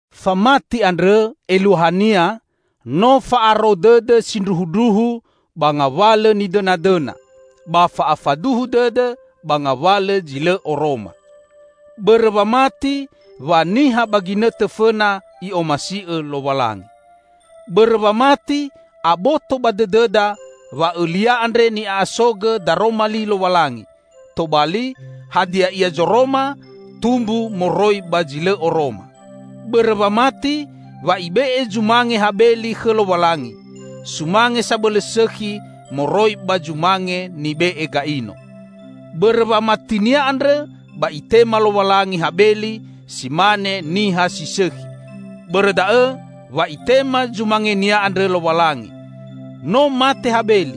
Famati andrõ eluahania no fa'aro dõdõ sindruhundruhu ba ngawalõ nidõnadõna; ba fa'afaduhu dõdõ ba ngawalõ zi lõ oroma. Bõrõ wamati, wa niha ba ginõtõ fõna I'omasi'õ Lowalangi. Bõrõ wamati, aboto ba dõdõda wa õlia andre ni'a'asogõ daroma li Lowalangi; tobali, hadia ia zoroma, tumbu moroi ba zi lõ oroma. Bõrõ wamati, wa ibe'e zumange Habeli khõ Lowalangi, sumange sabõlõ sõkhi moroi ba zumange nibe'e Ga'ino. Bõrõ wamatinia andrõ ba Itema Lowalangi Habeli si mane niha si sõkhi; bõrõ da'õ wa Itema zumangenia andrõ Lowalangi. No mate Habeli,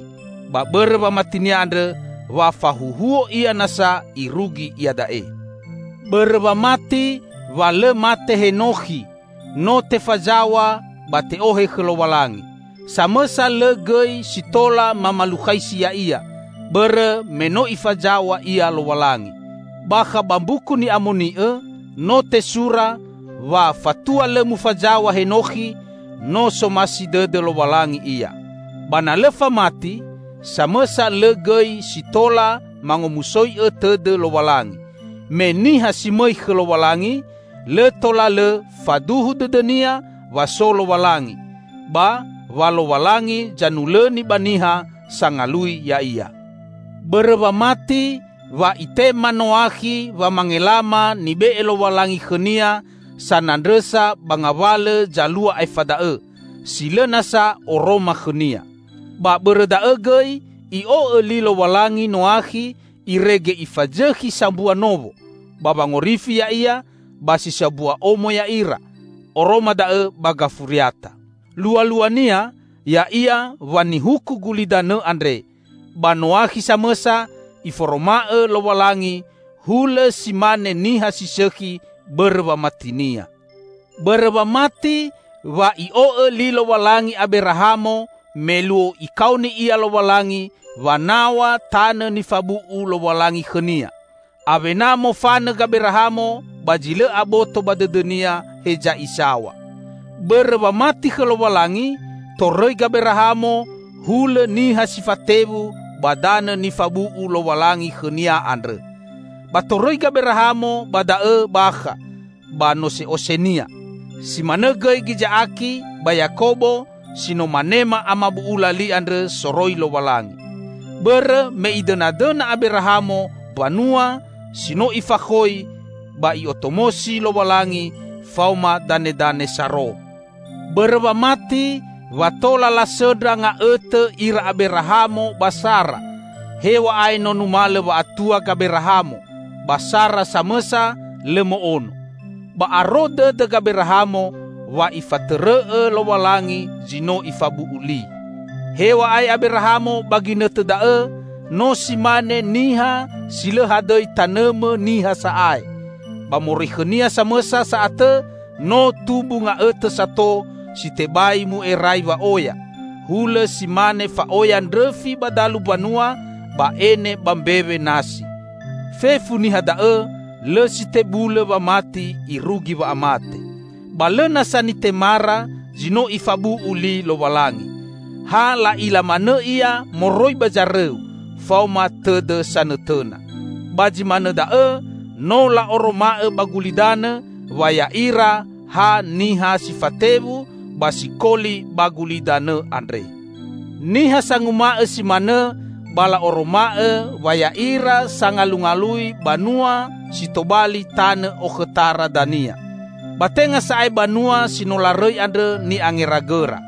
ba bõrõ ba wamatinia andrõ wa fahuhuo ia nasa irugi iada'e. Bõrõ wamati, wa lõ mate Henokhi, no tefazaw̃a ba te'ohe khõ Lowalangi. Samõsa lõ gõi si tola mamalukhaisi ya'ia, bõrõ me no Ifazaw̃a ia Lowalangi. Bakha ba Mbuku Ni'amoni'õ no tesura wa fatua lõ mufazaw̃a Henokhi, no somasi dõdõ Lowalangi ia. Ba na lõ famati, samõsa lõ gõi si tola mangomusoi'õ tõdõ Lowalangi. Me niha si mõi khõ Lowalangi lõ tola lõ faduhu dõdõnia wa so Lowalangi, ba wa Lowalangi zanulõni ba niha sangalui Ya'ia. Bõrõ wamati, wa itema Noakhi wamangelama nibe'e Lowalangi khõnia sanandrõsa ba ngawalõ zalua aefa da'õ, si lõ nasa oroma khõnia. Ba bõrõ da'õ gõi i'o'õ Li Lowalangi Noakhi irege ifazõkhi sambua nowo, ba wangorifi ya'ia ba si sambua omo ya'ira, oroma da'õ ba gafuriata. Lualuania ya'ia wa nihuku gulidanõ andre, ba Noakhi samõsa Iforoma'õ Lowalangi hulõ si mane niha si sõkhi bõrõ wamatinia. Bõrõ wamati, wa i'o'õ li Lowalangi Aberahamo me luo Ikaoni ia Lowalangi wanaw̃a tanõ nifabu'u Lowalangi khõnia. Awena mofanõ Gaberahamo ba zi lõ aboto ba dõdõnia heza isaw̃a. Bõrõ wamati khõ Lowalangi, torõi Gaberahamo hulõ niha si fatewu ba danõ nifabu'u Lowalangi khõnia andrõ. Ba torõi Gaberahamo ba da'õ bakha ba nose'osenia. Si manõ gõi Giza'aki ba Yakobo si no manema amabu'ula li andrõ soroi Lowalangi. Bõrõ me idõnadõna Aberahamo mbanua si no ifakhoi ba I'otomosi Lowalangi faoma danedane saro. Bõrõ wamati, wa tola lasõndra nga'õtõ ira Aberahamo ba Sara, hew̃a'ae no numalõ wa'atua Gaberahamo, ba Sara samõsa lõ mo'ono. Ba aro dõdõ Gaberahamo wa Ifatõrõ'õ Lowalangi zi no Ifabu'u li. Hew̃a'ae Aberahamo ba ginõtõ da'õ no si mane niha si lõ hadõi tanõmõ niha sa'ae, ba moroi khõnia samõsa sa'atõ no tumbu nga'õtõ sato si tebai mu'erai wa'oya -- hulõ si mane fa'oya ndrõfi ba dalumbanua ba ene ba mbewe nasi. Fefu niha da'õ lõ si tebulõ wamati irugi wa'amate. Ba lõ nasa nitemara zi no Ifabu'u li Lowalangi. Ha la'ila manõ ia moroi ba zarõu faoma tõdõ sanõtõna. Ba zi manõ da'õ no la'oroma'õ ba gulidanõ wa ya'ira ha niha si fatewu ba sikoli ba gulidanõ andre. Niha sanguma'õ si manõ ba la'oroma'õ wa ya'ira sangalungalui banua si tobali tanõ okhõtara dania. Ba tenga sa'ae banua si no larõi andrõ ni'angeragõra.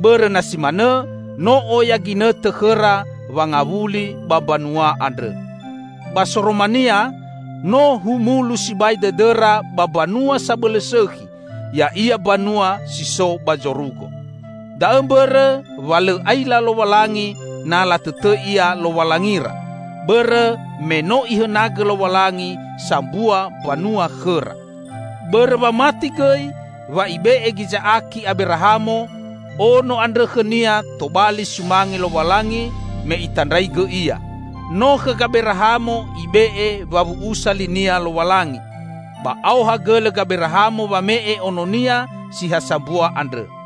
Bõrõ na si manõ, no oya ginõtõ khõra wangawuli ba mbanua andrõ. Ba soromania, no humulu sibai dõdõra ba mbanua sabõlõ sõkhi, ya'ia mbanua si so ba zorugo. Da'õ mbõrõ wa lõ aila Lowalangi na latõtõi Ia Lowalangira, bõrõ me no Ihõnagõ Lowalangi sambua mbanua khõra. Bõrõ wamati gõi, wa ibe'e Giza'aki Aberahamo, ono andrõ khõnia tobali sumange Lowalangi me Itandraigõ ia. No khõ Gaberahamo Ibe'e wawu'usa li-Nia Lowalangi, ba aoha gõlõ Gaberahamo wame'e ononia si ha sambua andrõ.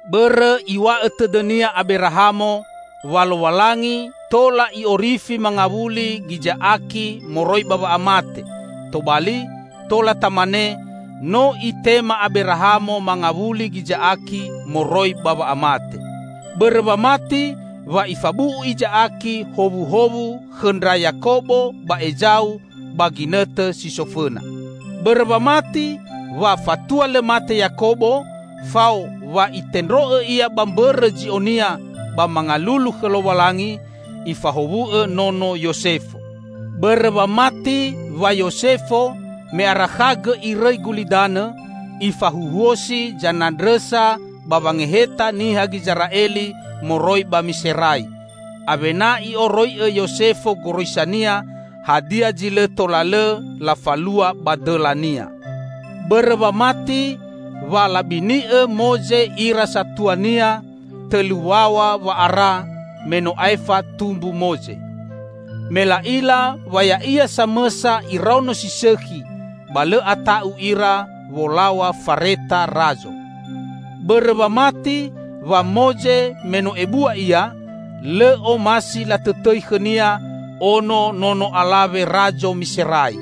Bõrõ iw̃a'õ tõdõnia Aberahamo, wa Lowalangi tola I'orifi mangawuli Giza'aki moroi ba wa'amate -- tobali, tola tamane, no itema Aberahamo mangawuli Giza'aki moroi ba wa'amate. Bõrõ wamati, wa ifabu'u Iza'aki howuhowu khõ ndra Yakobo ba Ezau ba ginõtõ si so fõna. Bõrõ wamati, wa fatua lõ mate Yakobo -- fao wa itendro'õ ia ba mbõrõ zi'onia ba mangalulu khõ Lowalangi -- ifahowu'õ nono Yosefo. Bõrõ wamati wa Yosefo -- me arakhagõ irõi gulidanõ -- ifahuhuosi zanandrõsa ba wangeheta niha Gizera'eli moroi ba Miserai. Awena i'oroi'õ Yosefo goroisania, hadia zi lõ tola lõ lafalua ba dõlania. Bõrõ wamati, wa labini'õ Moze ira satuania tõlu waw̃a wa'ara me no aefa tumbu Moze. Me la'ila wa ya'ia samõsa iraono si sõkhi, ba lõ ata'u ira wolaw̃a fareta razo. Bõrõ wamati, wa Moze me no ebua ia, lõ omasi latõtõi khõnia ono nono alawe razo Miserai.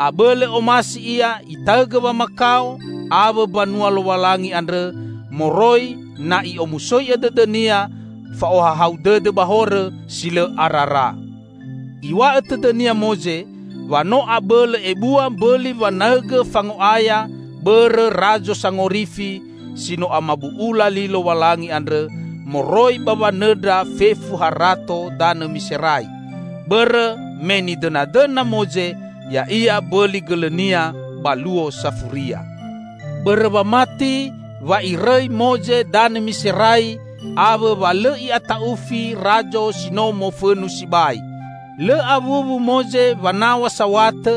Abõlõ omasi ia itaõgõ wamakao awõ mbanua Lowalangi andrõ moroi na i'omusoi'õ dõdõnia, fa'ohahau dõdõ ba horõ, si lõ arara. Iw̃a'õ tõdõnia Moze wa no abõlõ ebua mbõli wanaõgõ fango'aya bõrõ Razo Sangorifi si no amabu'ula li Lowalangi andrõ, moroi ba wanõndra fefu harato danõ Miserai; bõrõ me nidõnadõna Moze ya'ia mbõli gõlõnia ba luo safuria. Bõrõ wamati, wa irõi Moze danõ Miserai awõ wa lõ i'ata'ufi razo si no mofõnu sibai. Lõ awuwu Moze wanaw̃a saw̃atõ,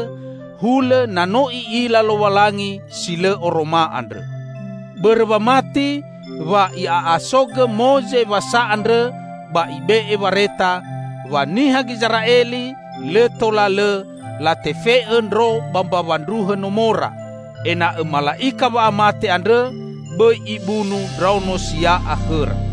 hulõ na no i'ila Lowalangi si lõ oroma andrõ. Bõrõ wamati, wa i'a'asogõ Moze Wasa andrõ ba ibe'e wareta, wa niha Gizera'eli lõ tola lõ latefe'õ ndro ba mbawa ndruhõ nomora, ena'õ Mala'ika wa'amate andrõ bõi ibunu ndraono sia'a khõra.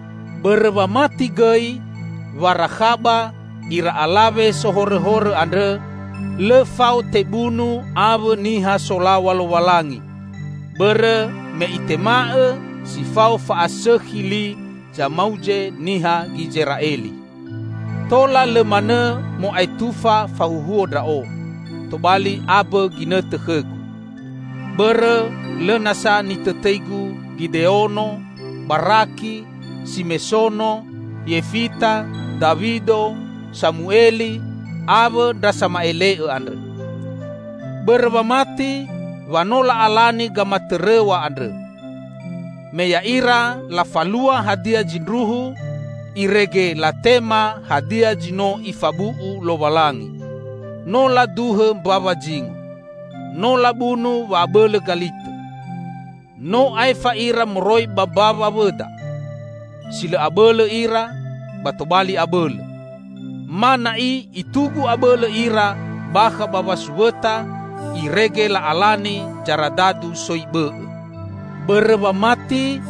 Bõrõ wamati gõi, wa Rakhaba, ira alawe sohorõhorõ andrõ, lõ fao tebunu awõ niha solaw̃a Lowalangi; bõrõ me itema'õ si fao fa'asõkhi li zamauze niha Gizera'eli. Tola lõ manõ mo'aetufa fahuhuo ndra'o, tobali ambõ ginõtõ khõgu. Bõrõ lõ nasa nitõtõigu Gideono, Baraki, Simesono, Yefita, Dawido, Samueli, awõ ndra sama'ele'õ andrõ. Bõrõ wamati, wa no la'alani gamatõrõw̃a andrõ. Me ya'ira lafalua hadia zindruhu, irege latema hadia zi no Ifabu'u Lowalangi. No laduhõ mbawa zingo. No labunu wa'abõlõ galitõ. No aefa ira moroi ba mbawa wõda. Si lõ abõlõ ira, ba tobali abõlõ; ma na'i itugu abõlõ ira bakha ba wasuwõta irege la'alani zaradadu soi bõ'õ. Bõrõ wamati,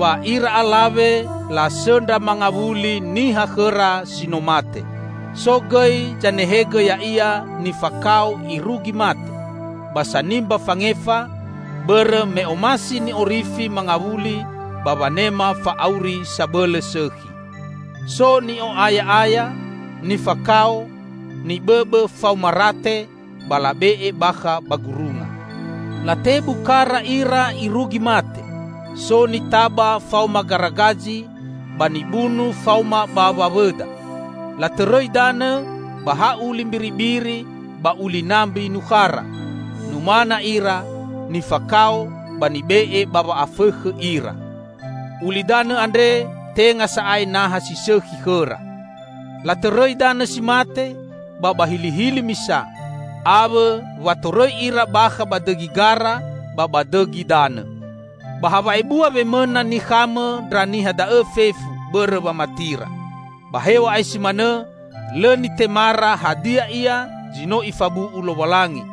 wa ira alawe lasõndra mangawuli niha khõra si no mate. So gõi zanehegõ ya'ia nifakao irugi mate, ba sanimba fangefa, bõrõ me omasi ni'orifi mangawuli ba wanema fa'auri sabõlõ sõkhi. So ni'o'aya'aya, nifakao, nibõbõ faoma rate ba labe'e bakha ba gurunga. Latebu kara ira irugi mate, so nitaba faoma garagazi, ba nibunu faoma bawa wõda. Latõrõi danõ ba ha uli mbiribiri ba uli nambi nukhara; numana ira, nifakao ba nibe'e ba wa'afõkhõ ira. Ulidanõ andre tenga sa'ae naha si sõkhi khõra. Latõrõi danõ si mate ba ba hilihili misa, awõ wa torõi ira bakha ba dõgi gara ba ba dõgi danõ. Ba ha wa'ebua wemõna nikhamõ ndra niha da'õ fefu bõrõ wamatira. Ba hew̃a'ae si manõ lõ nitemara hadia ia zi no Ifabu'u Lowalangi,